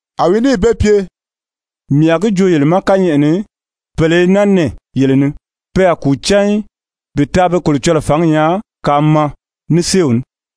A wi níì be pye: «Mii a gi joo yele ma kányɛʔɛ ni, pèle i naa nɛɛ yele ni, pe a kùu cán í bi taa be Kolocɔlɔɔ fǎngi nyaa kaa maa ní séew ní.»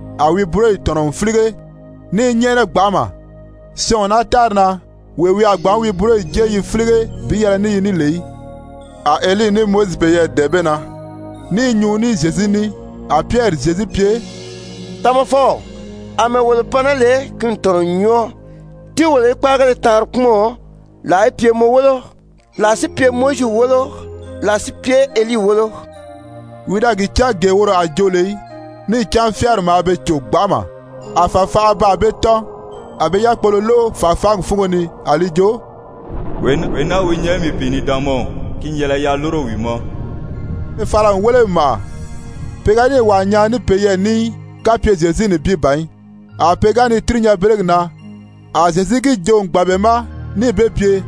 a wi búroyi tɔ̀nɔ n fílige ní i nyɛ́ʔɛnɛ gbanʔama, syɔɔn o naa tári na, wee wi a gbǎn wi buroyo jée yi fílige bi yɛlɛ ní yi ní lè í. A Elii ní Mowizi peyɛɛ dɛ̀ɛn be na, ní i nyuu ní Zyezu ní. A Pyɛri Zyezu pye: «Tamafɔw, àmɛɛ wolo pan naa lè, ki n tɔ̀nɔ n nyɔɔ. Tíi wolo í kpáagéle taanri kpúmɔn, làa í pye mɔ wólo, làa si pye Mowizi wólo, làa si pye Elii wólo.» Wi da gi cán gee woro a joo lè í, níì cán fyáari maa be cò gbanʔama. A fàfanʔa baa be tɔ́n, a be yákpolo lóʔo fàfaangi fúngo ni a li jo: «Wee naa wi nyɛ mii pìinidaanmaw, ki n yɛlɛ yaa lúro wi ma.» A be fala n wéle n màʔa, pe ga níì wàa nyaa ní peyɛɛ ní í, kapye Zyezu nibin ban í. A pe ga ni tíri nyanbelegi na, a Zyezu gi joo n gbàn be ma níì be pye,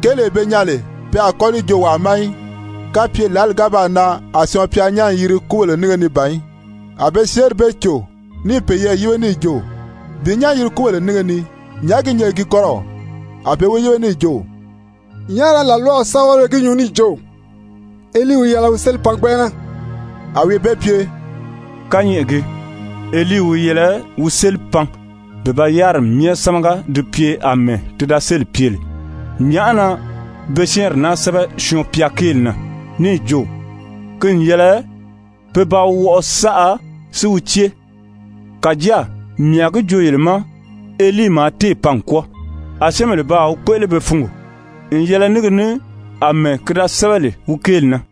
kéelee be nyaa lè pe a kɔ́ li joo wàa ma í kapye lǎli ga baa nan a Syɔɔn-pya nyán n yiri kúbèle nínge ni ban í. A be syɛ́ɛnri bee cò, ní i peyɛɛ yíbe níì jo: Bi nyán yiri kúbéle nínge ni, nyàʔá gi nyɛ gi kɔ́rɔw? A be wi yíbe níì jo: «Nyàʔá na làlwaw sɛ́bɛwelebéle gi nyuu níì jo: Elii wi yɛlɛ wi séli pan gbɛnʔɛnɛ?» A wi be pye: «Kányɛʔɛ gii, Elii wi yɛlɛ wi séli pan bi ba yáriri myɛ sámaga di pye àmɛɛ ti da séli pye lè. Nyàʔá na be syɛ́ɛnri naa sɛ́bɛ Syɔɔn-pya kéeli na, níì jo ki n yɛlɛ pe ba wi wɔʔɔ saʔa si wi cée? Kàjáa mii a gi joo yele ma Elii maa téè pan n kwɔ́ɔ, a syɛ́ɛnbèle baa wi kpéʔele be fungo n yɛlɛ ní gi ní àmɛɛ ki da sɛ́bɛ lè wi kéeli na.»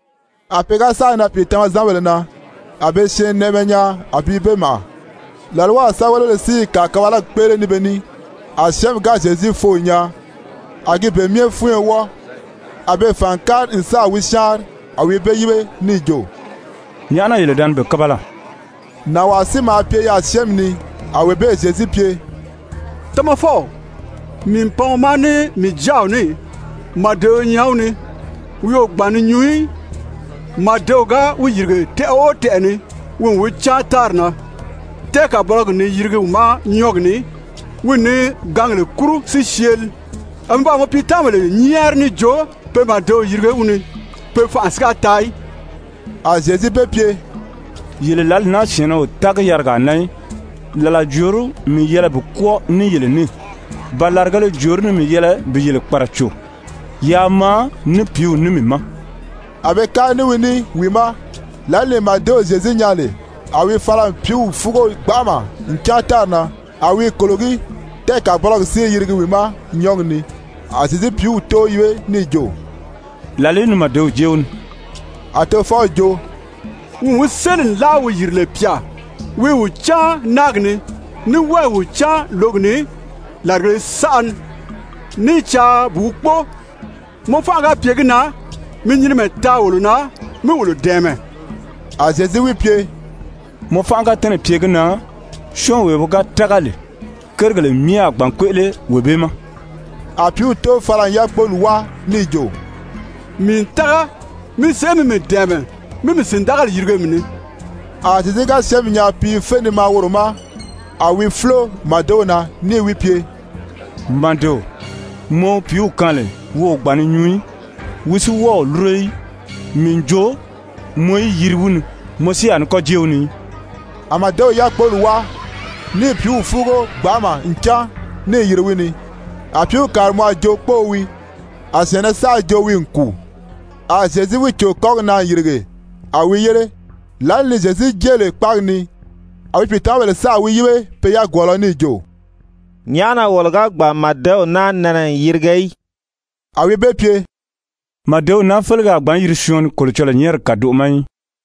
A pe ga sáà nan pìitamazanbèle na, a be syɛɛnnɛʔɛmɛ nyaa a bi be màʔa, làlwaw sɛ́bɛwelebéle si i kàkabalagi kpéʔele ní be ní. A syɛ́ɛnmi ga Zyezu foo n nyaa, a gi be myɛ fúnyo wɔ́ɔ, a be fàn n kári n sáà wi syáanri. A wi be yíbe níì jo: «Nyàʔá na yele da ni be kábala?» Nànwaa si maa pye yaà syɛ́ɛnmi ni, a wee bee Zyezu pye: «Tamafɔw, mii n pan mɔ ma ní mii jáaw ní, màdeo i nyɛ wi ni, wi o gbàn ni nyuu í. Màdew ga wi yìrige tɛʔɛ o tɛʔɛ ni, wi n wi cáan tári na, tɛ́ɛkabɔlɔgi n ni yirigi wi ma nyɔ́ɔgi ni, wi n ni gǎngèle kúru si syeeli. A mii baa mɔ piitamabèle nyɛ́ɛri níì jo pe màdew yirige wi ni, pe fanʔa si ga taa í.» A Zyezu be pye: «Yele lǎli naa syɛ̀ɛnnɛ o tági yarigaa na í, làla jòorí mii yɛlɛ bi kwɔ́ɔ ní yele ní? Ba làrigēle jòorí ni mii yɛlɛ bi yele kpàraco? Yaa maa ní pìíw ní mii ma.» A be kári ní wi ní wi ma, lǎli ni màdew Zyezu nyaa lè, a wi fala n pìíw fúugo gbanʔama n cáan tári na, a wi i kòlogí, tɛ́ɛkabɔlɔgi si i yirigi wi ma nyɔ́ɔgi ni. A Zyezu pìíw tóo yíbe níì jo: «Làlìí ni màdew jée wi ni?» A tofɔw jo: «Wi n wi séli nlaa wi yìri lè pyà. Wi i wi cáan náagi ni, ní wɔ́ɔ i wi cáan lǒgi ni làrigēle saʔa ni, ní i caa bi wi kpóo. Mɔ fánʔa ga pye gi na mi nyinimɛ taa wolo na mí wolo dɛ̀ɛmɛ.» A Zyezu wi pye: «Mɔ fánʔa ga tɛ́nɛ̀ pye gi na, syɔ́ɔnwee wi ga tága lè, kérigèle myɛ a gbǎn kpéʔele wee bee ma.» A pìíw tóo fala n yákpoli wáa níì jo: «Mii n tága! Mi sèʔé mi mii dɛ̀ɛmɛ, mí mii sìndagali yirige mii ni!» A Zyezu ga syɛ́ɛnmi nyaa pi i fé ni maa woro ma, a wi fúlo màdew na níì wi pye: «Màdeo, mɔ wi pìíw kaan lè wi o gbàn ni nyuu í, wi si wɔ́ɔ o lúro í, mii n jo mɔ í yiri wi ni, mɔ si a ní kɔ́ jée wi ni í.» A màdew yákpoli wáa níì pìíw fúugo gbanʔama n cáan, níì yiri wi ni. A pìíw kàri mɔ a jo kpóō wii, a syɛ̀ɛnnɛ saʔa jo wi n kùu. A Zyezu wi cò kɔ́gi na n yìrige, a wi yére. Lǎli ni Zyezu jée lè kpáagi ni, a wi pìitamabèle sáà wi yíbe pe yagwɔɔlɔ níì jo: «Nyàʔá na wolo ga gbàn n màdew naa nɛnɛ n yirige í?» A wi be pye: «Màdew naa félege a gbǎn yiri syɔɔn ni Kolocɔlɔɔ nyɛ́ɛrigi kàdoʔo ma í.»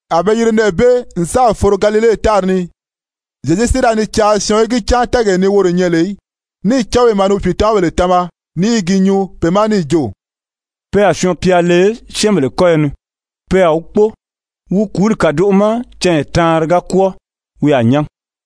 A be yiri nɛɛ bee n sáà foro Galile tári ni. Zyezu si da ni caa syɔɔn í gi cán tɛ́ɛgee ni woro nyɛ lè í. Níì cán wi maa ni wi pìitamabèle tama ní i gi nyuu be ma níì jo: «Pe a Syɔɔn-pya le syɛ́ɛnbèle kɔ́yɔ ni. Pe a wi kpóo, wi kùúli kàdoʔo ma canya taanri ga kwɔ́ɔ wi a nyán.»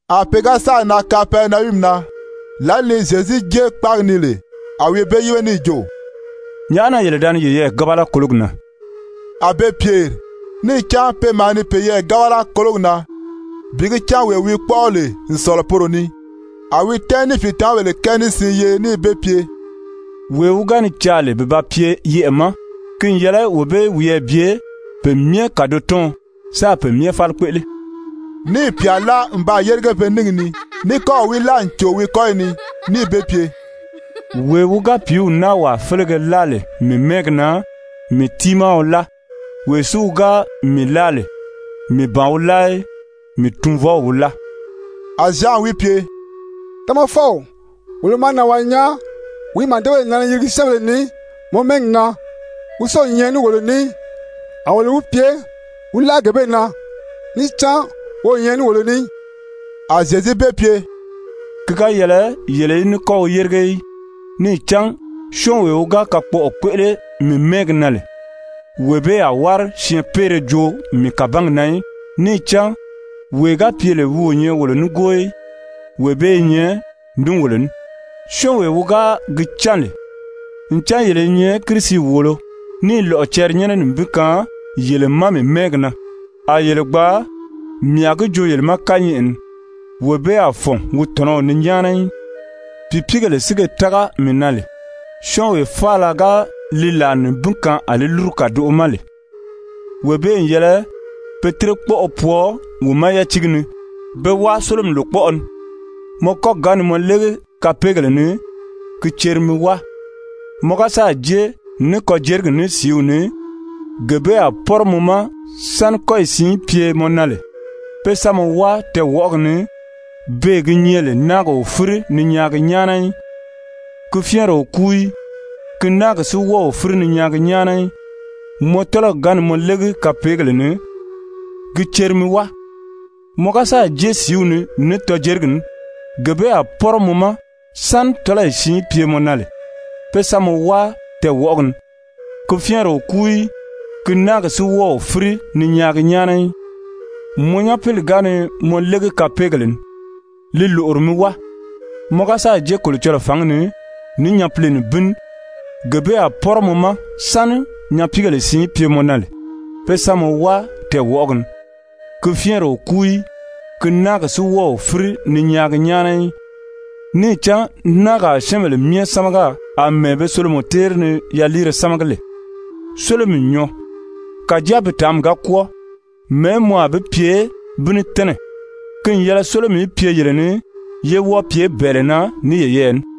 A pe ga sáà nan Kapɛrinayumi na, lǎli ni Zyezu jée kpáagi ni lè, a wi be yíbe níì jo: «Nyàʔá na yele da ni yeyɛɛ gábala kólogi na?» A be pyèri níì cán pe maa ni peyɛɛ gábala kólogi na bi gi cán wee wi kpɔ́ʔɔ lè n sɔ̀lɔ poro ni. A wi tɛ́ɛn níì pìitamabèle kɛɛ ní siin yeri níì be pye: «Wee wi ga ni caa lè bi ba pye yɛʔɛ̀ ma, ki n yɛlɛ wee bee í wiyɛɛ bye pe myɛ kàdotɔɔn sáā pe myɛ fáli kpéʔele.» Níì pyà láa n baa yérige pe níngi ni, ní kɔ́ɔ̀ wi láa n cò wi kɔ́yi ni níì be pye: «Wee wi ga pìíw naa wàa félege láa lè mii mɛ́ɛgi na, mii tiimaa wi láa. Wee si wi ga mii láa lè, mii ban wi láa í, mii Tunvɔw wi láa.» A Zyan wi pye: «Tamafɔw, wolo maa nànwaa nyaa wi i màdebèle nɛnɛ ni yirigi syɛ́ɛnbèle ni mɔ mɛ́ɛgi na, wi si o nyɛ ní wolo ní í. A wolo wi pye wi láʔa gee bee na, níì cán wi o nyɛ ní wolo ní í.» A Zyezu be pye: «Ki ga yɛlɛ yele í ní kɔ́ wi yérige í, níì cán syɔ́ɔnwee wi ga kakpɔʔɔ kpéʔele mii mɛ́ɛgi na lè, wee bee a wári syɛɛnpeere joo mii kàbangi na í. Níì cán wee ga pye lè wi o nyɛ wolo nígoo í, wee bee i nyɛ ní wolo ní. Syɔ́ɔnwee wi ga gi cán lè ncan yele i nyɛ Kirisi wòolo, níì lɔ̀ʔɔ cɛrinyɛnnɛ nibin kaan yele ma mii mɛ́ɛgi na, a yele gbaa, mii a gi joo yele ma kányɛʔɛ ni, wee bee a fɔ̀n wi tɔ̀nɔw ni nyáana í. «Pìipiigèle si ge tága mii na lè, syɔ́ɔnwee faala ga li làa nibin kaan a li lúru kàdoʔo ma lè, wee bee n yɛlɛ pe tírekpɔʔɔ pwɔɔ wi ma yátiigi ni be wáa sólomi lòkpɔʔɔ ni. Mɔ kɔ́gi ga ni mɔ légi kapeegèle ni, gi ceri mi wáa. Mɔ ga sáà jée ní kɔjerigi ní sìíw ni, gee bee a pɔ́rɔ mɔ ma, sáni kɔ́yi siin í pye mɔ na lè pé sa mɔ wáa tɛɛwɔʔɔgi ni, beè gi nyɛ lè náagi o fíri ni nyaagi nyáana í, [ ki fyɛ́ɛnri o kúu í, ki náagi si wɔ́ɔ o fíri ni nyaagi nyáana í.] Mɔ tɔ́lɔgi ga ni mɔ légi kapeegèle ni, gi ceri mi wáa. Mɔ ga sáà jée sìíw ni ní tɔjerigi ní, gee bee a pɔ́rɔ mɔ ma, sáni tɔ́lɔyi siin í pye mɔ na lè pé sa mɔ wáa tɛɛwɔʔɔgi ni. [ Ki fyɛ́ɛnri o kúu í, ki náagi si wɔ́ɔ o fíri ni nyaagi nyáana í.] Mɔ nyapili ga ni mɔ légi kapeegèle ni, li lòʔori mi wáa. Mɔ ga sáà jée Kolocɔlɔɔ fǎngi ni ní nyapile nibin ní, gee bee a pɔ́rɔ mɔ ma, sáni nyapiigèle siin í pye mɔ na lè pé sa mɔ wáa tɛɛwɔʔɔgi ni. Ki fyɛ́ɛnri o kúu í, ki náagi si wɔ́ɔ o fíri ni nyaagi nyáana í. Níì cán náagi a syɛ́ɛnbèle myɛ sámaga àmɛɛ be solomɔ téeri ni yaliire sámagi lè. Sólomi n nyɔɔ, kàjáa bi tàánmi ga kwɔ́ɔ, mɛ̀ɛ́ mɔ a bi pye bi ní tɛ́nɛ? Ki n yɛlɛ sólomi í pye yele ni, ye wɔ́ɔ pye bɛ̀ɛlɛ na ní yeyɛɛ ní.»